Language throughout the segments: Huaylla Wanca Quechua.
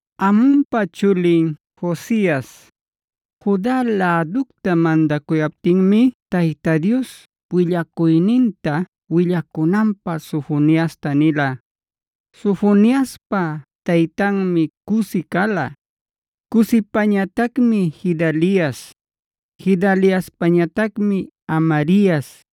Amonpa chulin Josias, Juda läducta mandacuyaptinmi Tayta Dios willacuyninta willacunanpä Sofoniasta nila.a Sofoniaspa taytanmi Cusi cala, Cusipañatacmi Gedalias, Gedaliaspañatacmi Amarias,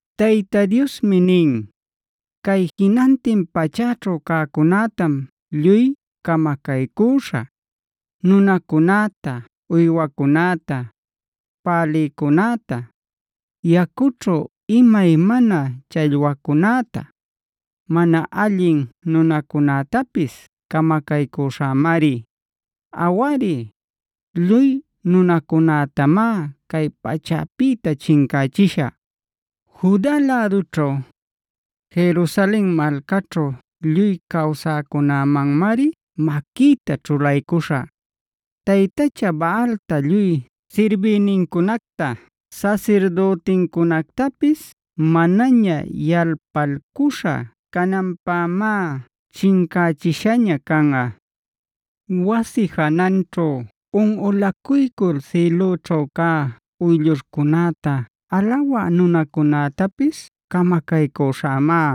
Tayta Diosmi nin: “Cay jinantin pachäćhu cäcunätam lluy camacaycüśhä. Nunacunäta, uywacunäta, pälïcunäta, yacućhu imaymana challwacunäta, mana allin nunacunätapis camacaycüśhämari. Awari, lluy nunacunätamá cay pachäpïta chincächishä. “Juda lädućhu, Jerusalen malcaćhu lluy cawsäcunämanmari maquïta ćhulaycuśhä. Taytacha Baalta lluy sirbïnincunacta sasirdütincunactapis manaña yalpalcuśha cananpämá chincächishaña canꞌa. Wasi jananćhu unꞌulacuycul sïlüćhu cä uyllurcunäta alawä nunacunätapis camacaycüśhämá.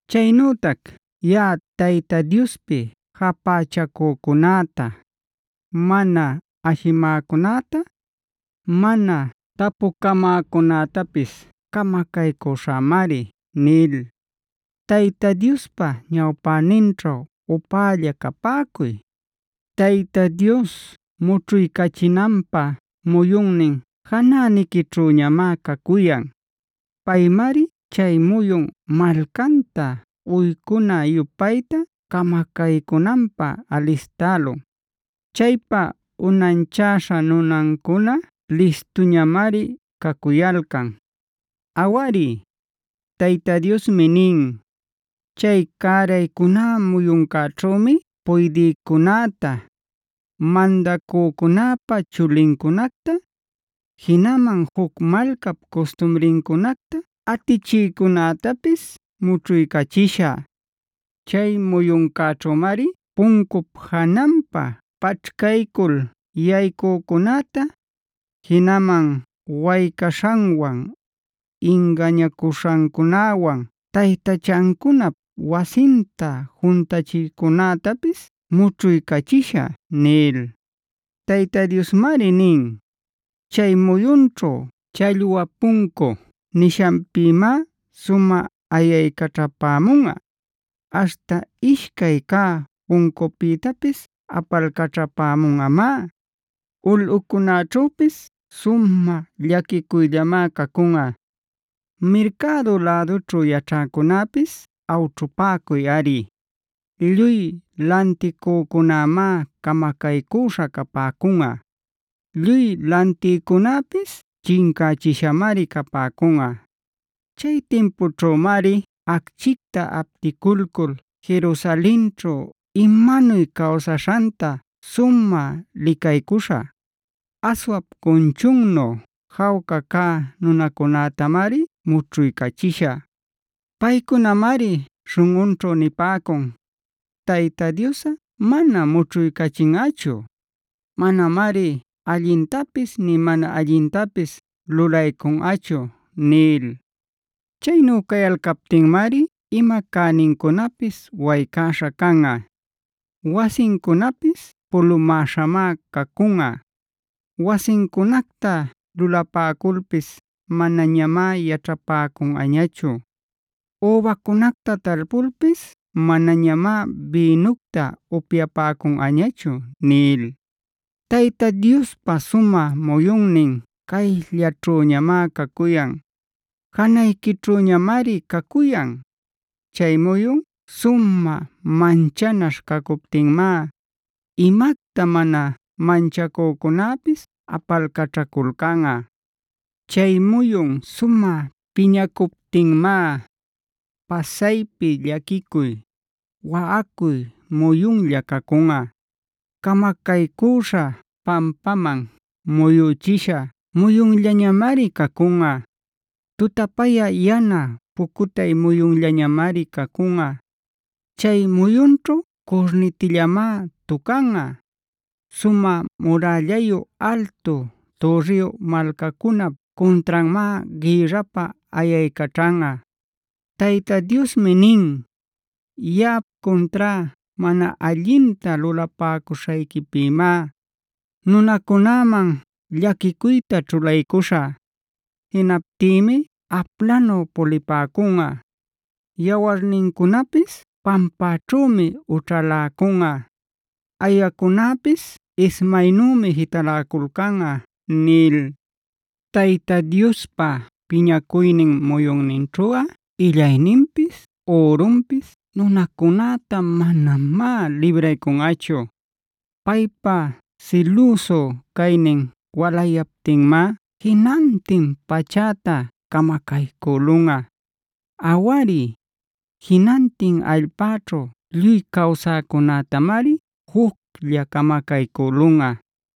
Chaynütac yaꞌa Tayta Diospi japächacücunäta, mana ashimäcunäta, mana tapucamäcunätapis camacaycüśhämari” nil. Tayta Diospa ñawpäninćhu upälla capäcuy.d Tayta Dios mućhuycachinanpä muyunnin janäniquićhüñamá cacuyan. Paymari chay muyun malcanta uycuna-yupayta camacaycünanpä alistälun. Chaypa unanchäśhae nunancuna listuñamari cacuyalcan. Awari, Tayta Diosmi nin: “Chay cäraycuná muyuncäćhümi puydïcunäta, mandacücunäpa chulincunacta, jinaman juc malcap custumrincunacta atichïcunätapis mućhuycachishä. Chay muyuncäćhümari puncup jananpä paćhcaycul yaycücunäta, jinaman waycaśhanwan, ingañacuśhancunawan taytachancunap wasinta juntachïcunätapis mućhuycachishä” nil. Tayta Diosmari nin: “Chay muyunćhu Challwa Puncu nishanpïmá sumä ayaycaćhapämunꞌa, aśhta ishcay cä puncupïtapis apalcaćhapämunꞌamá; ulꞌucunäćhüpis sumä llaquicuyllamá cacunꞌa. Mercado lädućhu yaćhäcunäpis awćhupäcuyꞌari. Lluy lanticücunämá camacaycüśha capäcunꞌa; lluy lantïcunäpis chincächishamari capäcunꞌa. “Chay timpućhümari achquicta apticulcul Jerusalenćhu imanuy cawsaśhanta sumä licaycuśhä. Aswap cunchunnu jawca cä nunacunätamari mućhuycachishä. Paycunamari śhunꞌunćhu nipäcun: ‘Tayta Diosꞌa manam mućhuycachinꞌachu; manamari allintapis nï mana allintapis lulaycunꞌachu’ nil. Chaynu cayalcaptinmari ima cänincunapis waycäśha canꞌa; wasincunapis pulumäśhamá cacunꞌa. Wasincunacta lulapäculpis manañamá yaćhapäcunꞌañachu; übacunacta talpulpis manañamá bïnucta upyapäcunꞌañachu” nil. Tayta Diospa sumä muyunnin cayllaćhüñamá cacuyan. Janayquićhüñamari cacuyan.f Chay muyun sumä manchanaśh cacuptinmá, imacta mana manchacücunäpis apalcaćhaculcanꞌa. Chay muyun sumä piñacuptinmá, pasaypi llaquicuy, waꞌacuy muyunlla cacunꞌa; camacaycüśha, pampaman muyüchisha muyunllañamari cacunꞌa; tutapayä yana pucutay muyunllamari cacunꞌa. Chay muyunćhu curnitillamá tucanꞌa, sumä murällayu altu türriyu malcacunap cuntranmá gïrrapä ayaycaćhanꞌa. Tayta Diosmi nin: “Yaꞌap cuntrá mana allinta lulapäcuśhayquipïmá nunacunäman llaquicuyta ćhulaycuśhä. Jinaptïmi aplanu pulipäcunꞌa; yawarnincunapis pampäćhümi ućhaläcunꞌa, ayacunäpis ismaynümi jitaläcunꞌa” nil. Tayta Diospa piñacuynin muyunninćhuꞌa illayninpis ürunpis nunacunäta manamá libraycunꞌachu. Paypa silüsu caynin walayaptinmá jinantin pachäta camacaycülunꞌa. Awari, jinantin allpäćhu lluy cawsäcunätamari juclla camacaycülunꞌa.